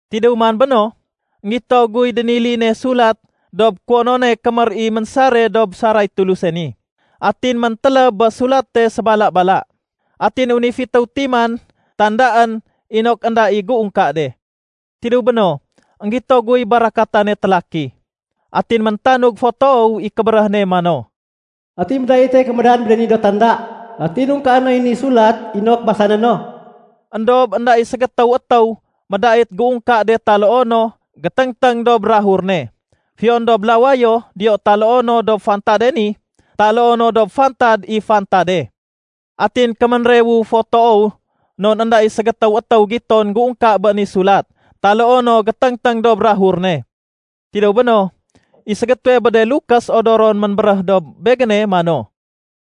Tidéw man béno, énggito guy déniline sulat dob kuwonone kémér i ménsare dob saray Tuluse ni. Atin méntéléb bé sulate sébala-bala. Atin wén i fitéw timan tandaén inok énda i géungka de. Tidéw béno, énggito guy barakatane télaki. Atin méntanug fo toow i kébéréh ne mano, “Ati médaite kémédan bé de ni do tanda atin ungkaé noy ni sulat inok basané no?” Endob énda i ségétéw étéw médait géungka de taloo no géténgténg dob bukag ne, fiyon dob lawayo diyo taloo no dob fantade ni taloo no dob fantad i fantade. Atin kéménrewu fo toow non énda i ségétéw étéw giton géungka bé ni sulat taloo no géténgténg dob bukag ne. Tidéw béno, i ségétéwe bé de lukés odoron ménbéréh dob begéne mano,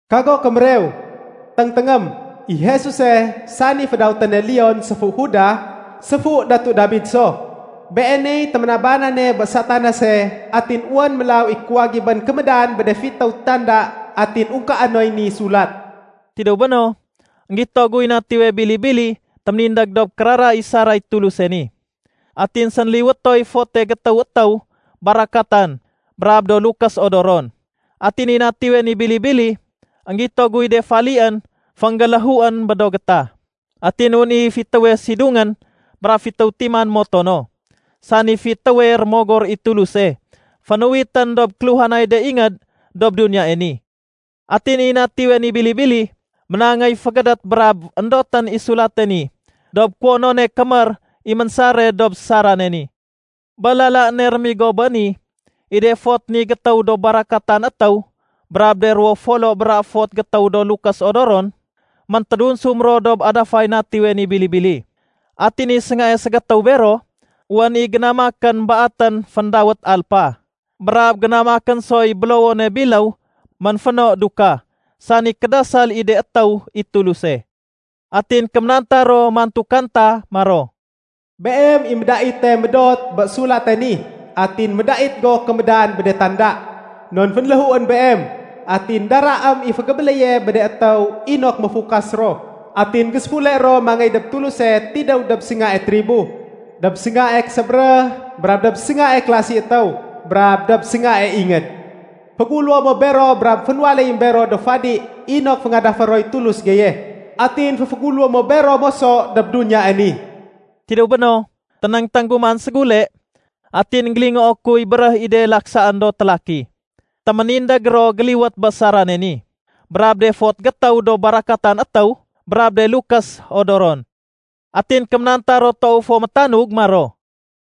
“Kago kémérew. Téngténgém. I Jesuse, sani fédawéténe ‘leon’ séfu Judah, séfu Datu Dabid so. Beeney téménabanane bé Satanase atin wén mélaw i kuwagibén kémédan bé de fitéw tanda atin ungkaé noy ni sulat.” Tidéw béno, énggito guy Natiwe Bili-bili téménindég dob kérara i saray Tuluse ni. Atin sénliwétoy fote gétéw étéw barakatan brab do lukés odoron. Atin i Natiwe ni Bili-bili, énggito guy de falién fénggéléhuén bé do gétah. Atin wén i fitéwe sidungén brab fitéw timan moto no, sani fitéwe rémogor i Tuluse fénuwitén dob kéluhanay de ingéd dob duniyae ni. Atin i Natiwe ni Bili-bili, ménangéy fégédét brab éndotén i sulate ni dob kuwonone kémér i ménsare dob sarane ni. Bé lala ne rémigo bé ni, i de fot ni gétéw do barakatan étéw brab de ruwo folo bra fot gétéw do lukés odoron, méntédunsum ro dob adafay Natiwe ni Bili-bili. Atin i séngae ségétéw bero, wén i génamakén baatén féndawét alpa, brab génamakén soy bélowone biléw ménféno dukah, sani kédasal i de étéw i Tuluse. Atin kéménanta ro mantu kanta maro, “Beem i médaite médot bé sulate ni atin médait go kémédan bé de tanda. Non fénléhuén Beem, atin daraém i fégébéléye bé de étéw inok méfukas ro atin géséfule ro mangéy dob Tuluse tidéw dob séngae tribo, dob séngae késébéréh, brab dob séngae kélasi étéw, brab dob séngae ingéd. Féguléwo mo bero brab fénwaléyém bero do fadi inok féngadafé roy Tulus geye. Atin féféguléwé mo bero moso dob duniyae ni.” Tidéw béno, ténéngténg gu man ségule atin énggélingoo kuy béréh i de laksaén do télaki. Téménindég ro géliwét bé sarane ni brab de fot gétéw do barakatan étéw brab de lukés odoron. Atin kéménanta ro toow fo métanug maro,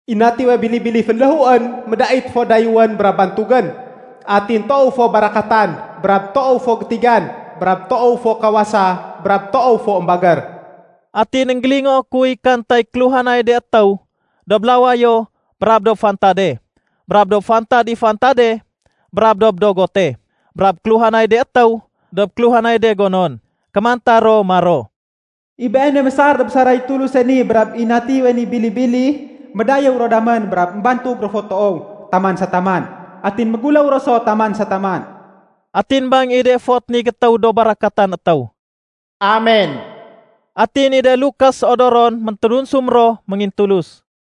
“I Natiwe Bili-bili fénléhuén médait fo dayéwén brab bantugén. Atin toow fo barakatan, brab toow fo gétigan, brab toow fo kawasa, brab toow fo émbagér.” Atin énggélingoo kuy kantay kéluhanay de étéw dob lawayo brab dob fantade brab dob fantad i fantade brab dob dogote, brab kéluhanay de étéw dob kéluhanay de gonon. Kémanta ro maro, “I Beene mésar dob saray Tuluse ni brab i Natiwe ni Bili-bili, médayéw ro damén brab émbantug ro fo toow taman sa taman. Atin méguléw ro so taman sa taman.” Atin bang i de fot ni gétéw do barakatan étéw, “Amen!” Atin i de lukés odoron méntédunsum ro méngintulus.